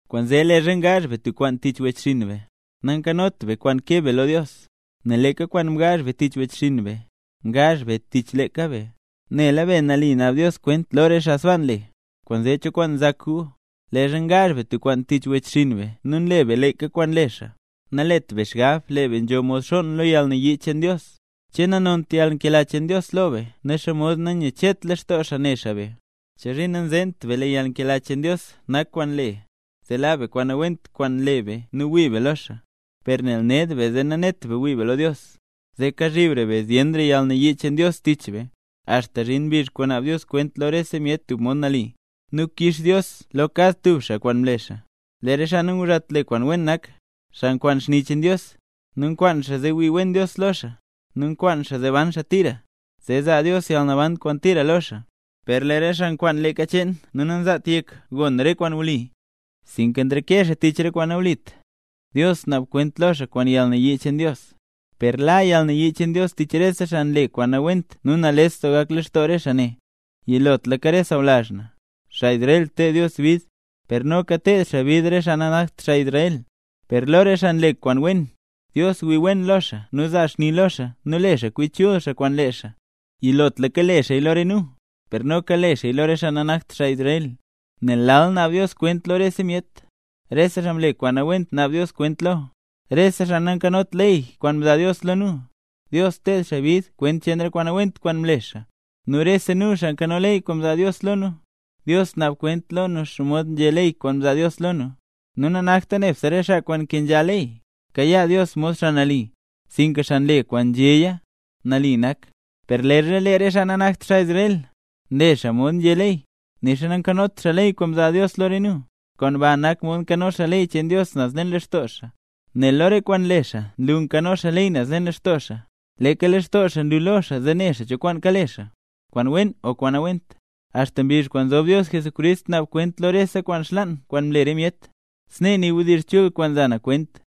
Kwaanzee leezha ngaazh be tub kwaan tich wechxinn be, nankanot be kwaan keb be lo Dios, nel leeka kwaan mgaazh be tich wechxinn be, ngaazh be leeka tich be. Nela be, nali naab Dios kwent lo re xaa sbaa nle. Kwaanzee, ¿cho kwaan nzak gu? Leezha ngaazh be tub kwaan tich wechxinn be nu nle be leeka kwaan nle xaa, nalet be xgab lee be nzho mod xonn lo yalnayii cheen Dios. ¿Che nanont yalnkela cheen Dios lo be nu xomod nanyachetla xaa ne xaa be? ¿Chozhiin nanzeent be, lee yalnkela cheen Dios nak kwaan le zee laa be kwaan nawent kwaan nle be nu wii be lo xaa? Per nel ned be zee nanet be wii be lo Dios, zee kazhibra be zyenra yalnayii cheen Dios tich be, axta zhin mbizh kwaan naab Dios kwent lo rese myet tub mod nali, nu kix Dios lo kad tub xaa kwaan mle xaa. Lee re xaa nanguzhat le kwaan wen, nak xaa nkwaan xni cheen Dios, nu nkwaan xaa zee wii wen Dios lo xaa, nu nkwaan xaa zee ban xaa tira, zee zaa Dios yalnaban kwaan tira lo xaa. Per lee re xaa nkwaan leeka cheen nu nanzaat yek gon re kwaan wli, sinka nreke xaa tich re kwaan nawlit, Dios naab kwent lo xaa kwaan yalnayii cheen Dios. Per la yalnayii cheen Dios tich rese xaa nle re kwaan nawent nu nales doo gak lextoo re xaa ne. Yilotlaka sawlazh na, xaa Israel, ted Dios bid, per noka ted xaa bid re xaa nanakt xaa Israel. Per lo re xaa nle kwaan wen, Dios wii wen lo xaa nu zaa xni lo xaa nu le xaa kwi chul xaa kwaan lee xaa. Yilotlaka le xaaya lo re nu, per noka le xaaya lo re xaa nanakt xaa Israel. Nel lal naab Dios kwent lo rese myet. Rese xaa mle kwaan nawent naab Dios kwent lo. Rese xaa nankanot ley kwaan mzaa Dios lo nu, Dios ted xaa bid kwent cheen re kwaan nawent kwaan mle xaa. Nu rese nu, xaa nkano ley kwaan mzaa Dios lo nu, Dios naab kwent lo xaa mod nzhé ley kwaan mzaa Dios lo nu. Nu nanakta nebse re xaa kwaan nkenzha ley kayaa Dios mod xaa nali, sinka xaa nle kwaan nzhéya, nali nak. Per leezha lee re xaa nanakt xaa Israel, nle xaa mod nzhé ley, nixa nankanot xaa ley kwaan mzaa Dios lo re nu, kwaan ba nak mod nkano xaa ley cheen Dios naz leen lextoo xaa. Nel lo re kwaan nle xaa nlu nkano xaa ley naz leen lextoo xaa. Leeka lextoo xaa nlu lo xaa zee ne xaa cho kwaan kale xaa, kwaan wen o kwaan nawent, axta mbizh kwaan zob Dios Jesucrist naab kwent lo rese kwaan xlaan kwaan mle re myet. Snee nii wdizh chul kwaan nza na kwent.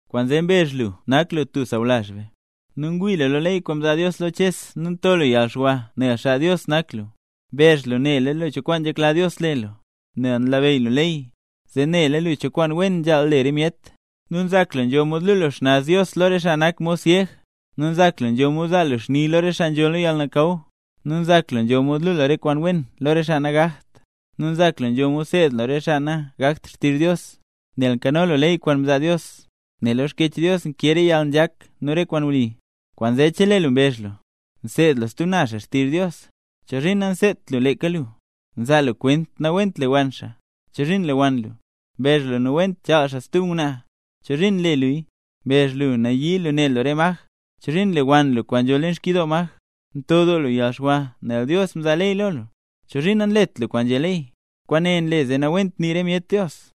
Kwaanzee mbezh lu nak lu tub sawlazh be, nu ngwii lu lo ley kwaan mzaa Dios lo Ches nu nto lu yalxwa nel xaa Dios nak lu. Mbezh lu nela lu cho kwaan nzhekla Dios le lu, nel nlabeyy lu ley, zee nela lu cho kwaan wen nzhaal le re myet. Nu nzak lu nzho mod luu lu xnaz Dios lo re xaa nak mod syeg, nu nzak lu nzho mod yazaa lu xni lo re xaa nzho lo yalnakaw. Nzak lu nzho mod lu lu re kwaan wen lo re xaa nagakt, nu nzak lu nzho mod seed lu re xaa nagakt xtizh Dios, nel nkano lu ley kwaan mzaa Dios, nel lo Xkyech Dios nkee re yalnzhak nu re kwaan wli. Kwaanzee chelee lu mbezh lu, nseed lu stub naz xaa xtizh Dios, ¿chozhiin nanseedt lu leeka lu? Nzaa lu kwent nawent lewann xaa, ¿chozhiin nlewann lu? Mbezh lu nawent chaal xaa stub ngwnaa, ¿chozhiin nle luya? Mbezh lu nayii lu ne lu re maj, ¿chozhiin nlewann lu kwaan nzho leen xkyidoo maj? Nto doo lu yalxwa nel Dios mzaa ley lo lu, ¿chozhiin nanlet lu kwaan nzhé ley? ¡Kwaane nle zee nawent nii re myet Dios!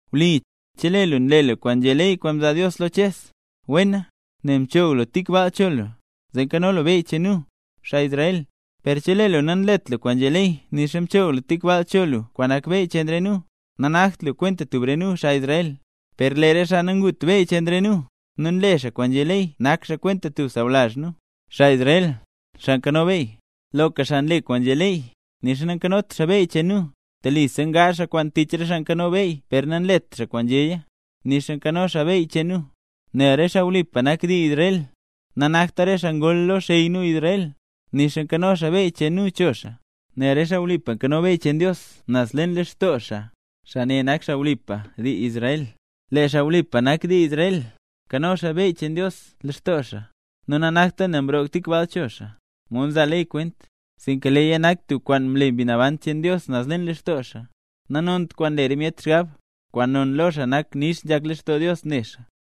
Wli, chelee lu nle lu kwaan nzhé ley kwaan mzaa Dios lo Ches, wena, nel mchoog lu tik baal cho lu, zee nzho lu beyy cheen nu, xaa Israel. Per chelee lu nanlet lu kwaan nzhé ley nixa mchoog lu tik baal cho lu kwaan nak beyy cheen re nu, nanakt lu kwenta tub re nu, xaa Israel. Per lee re xaa nangut beyy cheen re nu, nu nle xaa kwaan nzhé ley, nak xaa kwenta tub xaa sawlazh nu, xaa Israel, xaa nzho beyy. Loka xaa nle kwaan nzhé ley, nixa nanzhot xaa beyy cheen nu, telisa ngaazh xaa kwaan tich re xaa nkano ley per nanlet xaa kwaan nzhéya, nixa nzho xaa beyy cheen nu. Nel re xaa wlipa nak dii Israel, nanakta re xaa gol lo xey nu Israel, nixa nzho xaa beyy cheen nu cho xaa, nel re xaa wlipa nzho beyy cheen Dios naz leen lextoo xaa, xaa ne nak xaa wlipa nak dii Israel. Lee xaa wlipa nak dii Israel, nzho xaa beyy cheen Dios naz leen lextoo xaa, nu nanakta nel mroog tik baal cho xaa, mod nzaa ley kwent, sinka leeya nak tub kwaan mle Mbi Naban cheen Dios naz leen lextoo xaa. Nanont kwaan nle re myet xgab, kwaan non lo xaa nak nix nzhak lextoo Dios ne xaa.